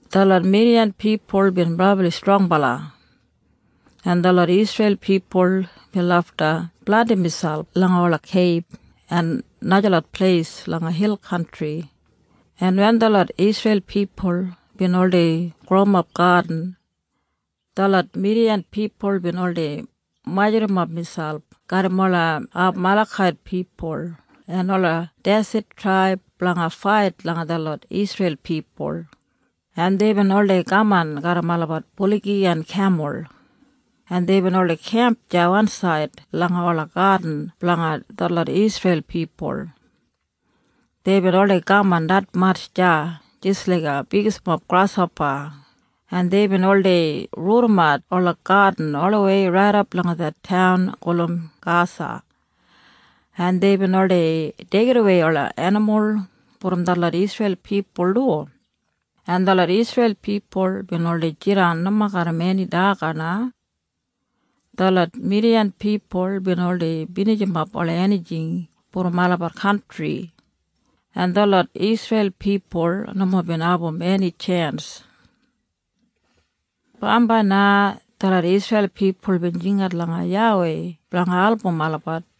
Detlot Midiyan pipul bin brabli strongbala, en detlot Isreil pipul bin lafta blandim miselp langa ola keib en najalot pleis langa hil kantri, en wen detlot Isreil pipul bin oldei growimap gadin, detlot Midiyan pipul bin oldei majurrumap miselp garram ola Amalekait pipul en ola deset traib blanga fait langa detlot Isreil pipul, en deibin oldei kaman garram olabat buligi en kemul, en deibin oldei kemp deya wansaid langa ola gadin blanga detlot Isreil pipul. Deibin oldei kaman detmatj deya jis laiga bigismob grashopa, en deibin oldei rudimat ola gadin olawei raidap langa det taun gulum Gasa, en deibin oldei deigidawei ola enimul brom detlot Isreil pipul du, en detlot Isreil pipul bin oldei jidan nomo garram eni daga na. Detlot Midiyan pipul bin oldei binijimap ola enijing brom olabat kantri, en detlot Isreil pipul nomo bin abum eni tjens. Bambai na detlot Isreil pipul bin jingat langa YAWEI blanga album olabat,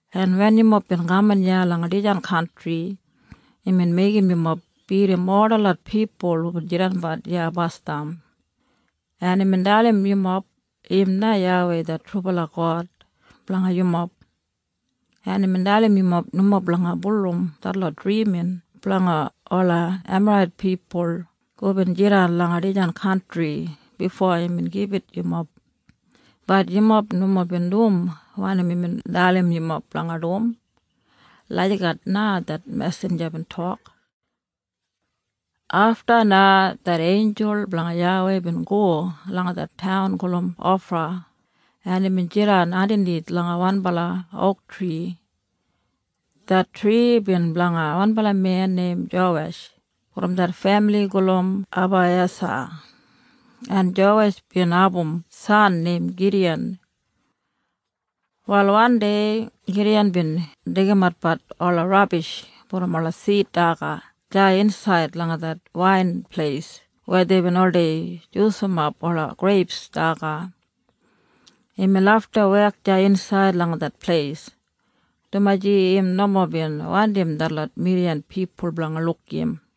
en wen yumob bin kaman iya langa dijan kantri, imbin meigim yumob bidim ol detlot pipul hubin jidanbat iya basdam, en imbin dalim yumob im na YAWEI det trubala God blanga yumob, en imbin dalim yumob nomo blanga bulurrum detlot drimin blanga ola Emarait pipul hubin jidan langa dijan kantri bifo imbin gibit yumob. Bat yumob nomo bin dum wanim imbin dalim yumob blanga dum.” Lagijat na det mesinja bin tok. Afta na det einjul blanga YAWEI bin go langa det taun gulum Ofra, en imbin jidan andanith langa wanbala ouktri. Det tri bin blanga wanbala men neim Jowesh brom det femili gulum Abaiyesa, en Jowesh bin abum san neim Gidiyan. Wal wandei Gidiyan bin deigimatbat ola rabish brom ola sid daga deya insaid langa det wainpleis weya deibin oldei jusumap ola greip daga. Imbin lafta wek deya insaid langa det pleis, dumaji im nomo bin wandim detlot Midiyan pipul blanga luk im.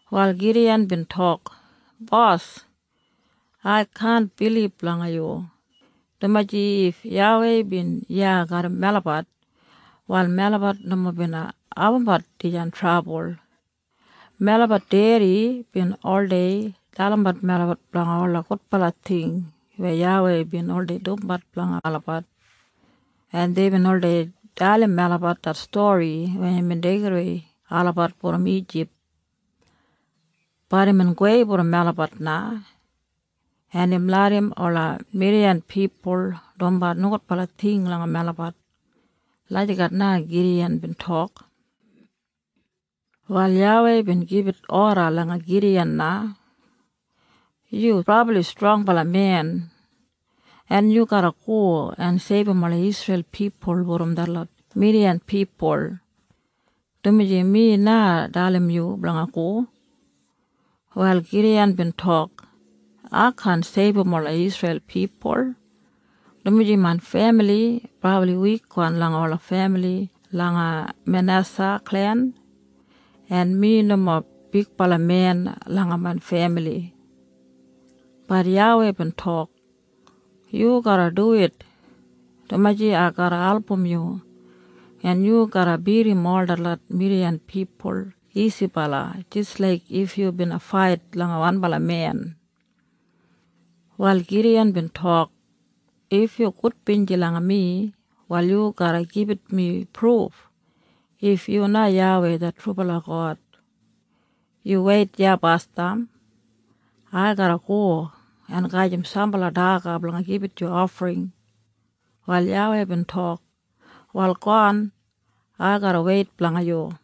Wal Gidiyan bin tok, “Bos, ai kaan bilib langa yu, dumaji if YAWEI bin iya garram melabat, wal melabat nomo bina abumbat dijan trabul. Melabat dedi bin oldei dalimbat melabat blanga ola gudbala ting weya YAWEI bin oldei dumbat blanga olabat, en deibin oldei dalim melabat det stori weya imbin deigidawei olabat brom Ijip. Bat imbin gowei brom melabat na, en im larram ola Midiyan pipul dumbat nogudbala ting langa melabat.” Lagijat na Gidiyan bin tok. Wal YAWEI bin gibit oda langa Gidiyan na, “Yu brabli strongbala men, en yu garra go en seibum ola Isreil pipul brom detlot Midiyan pipul, dumaji mi na dalim yu blanga go.” Wal Gidiyan bin tok, “Ai kaan seibum ola Isreil pipul, dumaji main femili brabli wikwan langa ola femili langa Manesa klen, en mi nomo bigbala men langa main femili.” Bat YAWEI bin tok, “Yu garra duwit, dumaji ai garra album yu, en yu garra bidim ol detlot Midiyan pipul isibala jis laik if yu bina fait langa wanbala men.” Wal Gidiyan bin tok, “If yu gudbinji langa mi, wal yu garra gibit mi pruf if yu na YAWEI det trubala God. Yu weit iya basdam. Ai garra go en gajim sambala daga blanga gibit yu ofring.” Wal YAWEI bin tok, “Wal gowan. Ai garra weit blanga yu.”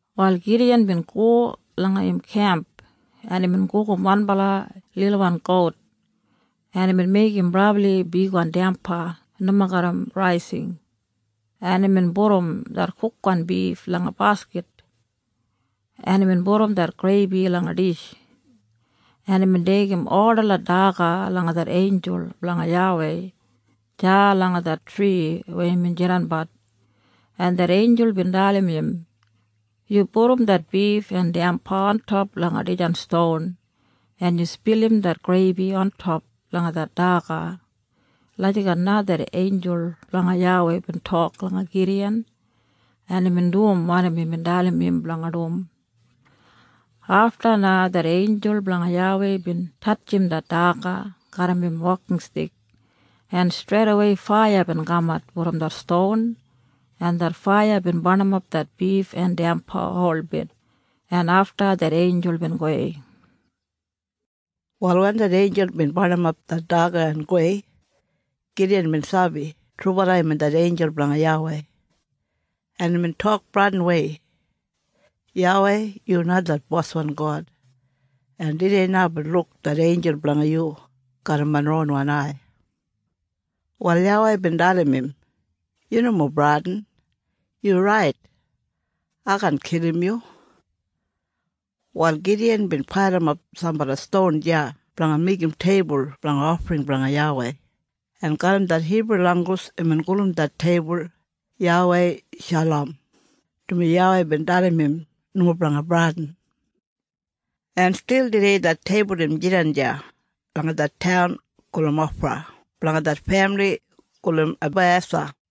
Wal Gidiyan bin go langa im kemp, en imbin gugum wanbala lilwan gout, en imbin meigim brabli bigwan damba nomo garram raising, en imbin pudum det kukwan bif langa baskit, en imbin pudum det greibi langa dish, en imbin deigim ol detlot daga langa det einjul blanga YAWEI deya langa det tri weya imbin jidanbat, en det einjul bin dalim im, “Yu pudum det bif en damba ontop langa dijan ston, en yu spilim det greibi ontop langa det daga.” Lagijat na det einjul blanga YAWEI bin tok langa Gidiyan, en imbin dum wanim imbin dalim im blanga dum. Afta na det einjul blanga YAWEI bin tatjim det daga garram im wokinstik, en streidawei faiya bin kamat brom det ston, en det faiya bin barnimap det bif en damba holbit, en afta det einjul bin gowei. Wal wen det einjul bin barnimap det daga en gowei, Gidiyan bin sabi trubala imbin det einjul blanga YAWEI, en imbin tok bradinwei, “YAWEI, yu na det boswan God, en tudei na aibin luk det einjul blanga yu garram main ronwan ai.” Wal YAWEI bin dalim im, “Yu nomo bradin. Yu rait. Ai kaan kilim yu.” Wal Gidiyan bin pailimap sambala ston deya blanga meigim teibul blanga ofring blanga YAWEI, en garram det Hibru langgus imbin gulum det teibul YAWEI Shalom, dumaji YAWEI bin dalim im nomo blanga bradin. En stil tudei det teibul im jidan deya langa det taun gulum Ofra blanga det femili gulum Abaiyesa.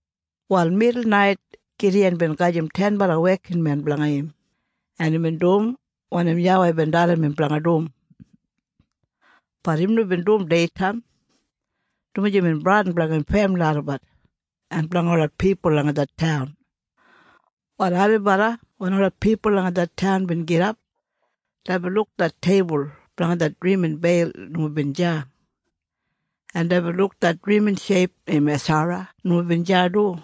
Wal midulnait Gidiyan bin gajim tenbala wekinmen blanga im, en imbin dum wanim YAWEI bin dalim im blanga dum. Bat im nomo bin dum deitaim, dumaji imbin bradin blanga im femili olabat en blanga ola pipul langa det taun. Wal ailibala wen ola pipul langa det taun bin gidap, deibin luk det teibul blanga det drimin Beil nomo bin deya, en deibin luk det drimin sheip neim Eshara nomo bin deya du,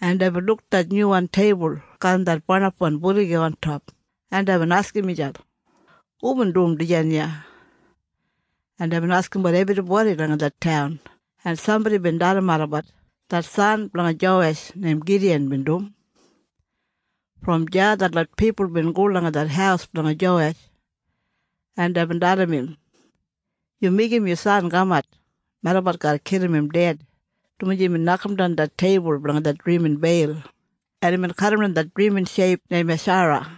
en deibin luk det nyuwan teibul garram det barnapwan buligi ontop, en deibin askim miselp, “Hubin dum dijan iya?” En deibin askimbat ebribodi langa det taun, en sambodi bin dalim olabat, “Det san blanga Jowesh neim Gidiyan bin dum.” Brom deya detlot pipul bin go langa det haus blanga Jowesh, en deibin dalim im, “Yu meigim yu san kamat. Melabat garra kilim im ded, dumaji imbin nokamdan det teibul blanga det drimin Beil, en imbin kadimdan det drimin sheip neim Eshara.”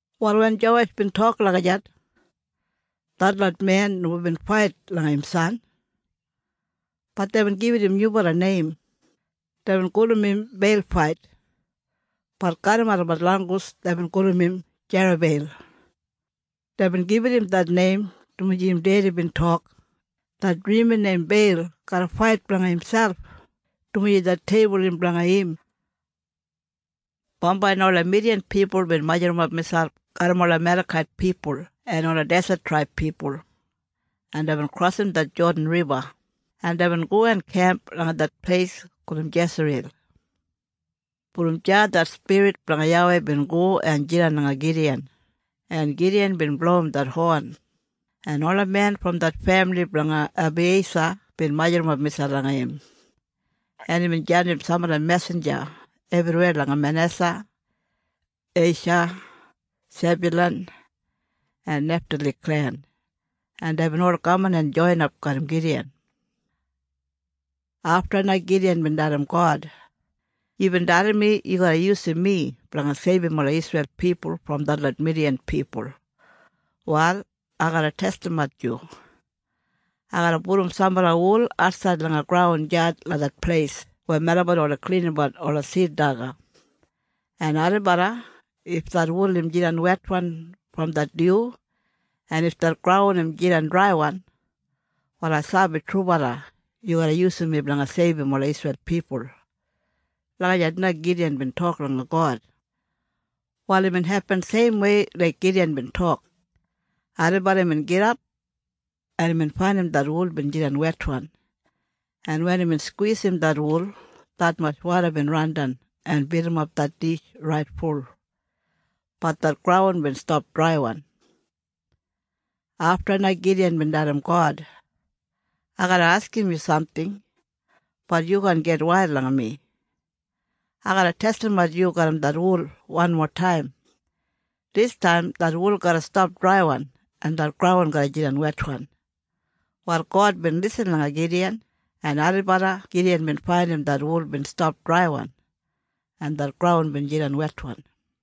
Wal wen Jowesh bin tok lagijat, detlot men nomo bin fait langa im san. Bat deibin gibit im nyubala neim. Deibin gulum im Beilfait. Bat garram olabat langgus deibin gulum im Jerabeil. Deibin gibit im det neim dumaji im dedi bin tok, “Det drimin neim Beil garra fait blanga imselp, dumaji det teibul im blanga im.” Bambai na ola Midiyan pipul bin majurrumap miselp garram ola Amalekait pipul en ola deset traib pipul, en deibin krosim det Jodan Riba, en deibin go en kemp langa det pleis gulum Jesriyel. Brom deya det spirit blanga YAWEI bin go en jidan langa Gidiyan, en Gidiyan bin blowim det hon, en ola men brom det femili blanga Abaiyesa bin majurrumap miselp langa im, en imbin jandim sambala mesinja ebriweya langa Manesa, Esha, Sebyulan en Neftali klen, en deibin ol kaman en joinin garram Gidiyan. Afta na Gidiyan bin dalim God, “Yubin dalim mi yu garra yusum mi blanga seibum ola Isreil pipul brom detlot Midiyan pipul. Wal ai garra testimat yu. Ai garra pudum sambala wul atsaid langa graun deya langa det pleis weya melabat oldei klinimbat ola sid daga, en ailibala if det wul im jidan wetwan brom det dyu en if det graun im jidan draiwan, wal ai sabi trubala yu garra yusum mi blanga seibum ola Isreil pipul.” Lagijat na Gidiyan bin tok langa God. Wal imbin hepin seimwei laik Gidiyan bin tok. Ailibala imbin gidap, en imbin faindim det wul bin jidan wetwan, en wen imbin skwisim det wul, detmatj woda bin randan en bilimap det dish raitful. Bat det graun bin stap draiwan. Afta na Gidiyan bin dalim God, “Ai garra askim yu samting. Bat yu kaan gitwail langa mi. Ai garra testimat yu garram det wul wanmotaim. Distaim det wul garra stap draiwan en det graun garra jidan wetwan.” Wal God bin lisin langa Gidiyan, en ailibala Gidiyan bin faindim det wul bin stap draiwan en det graun bin jidan wetwan.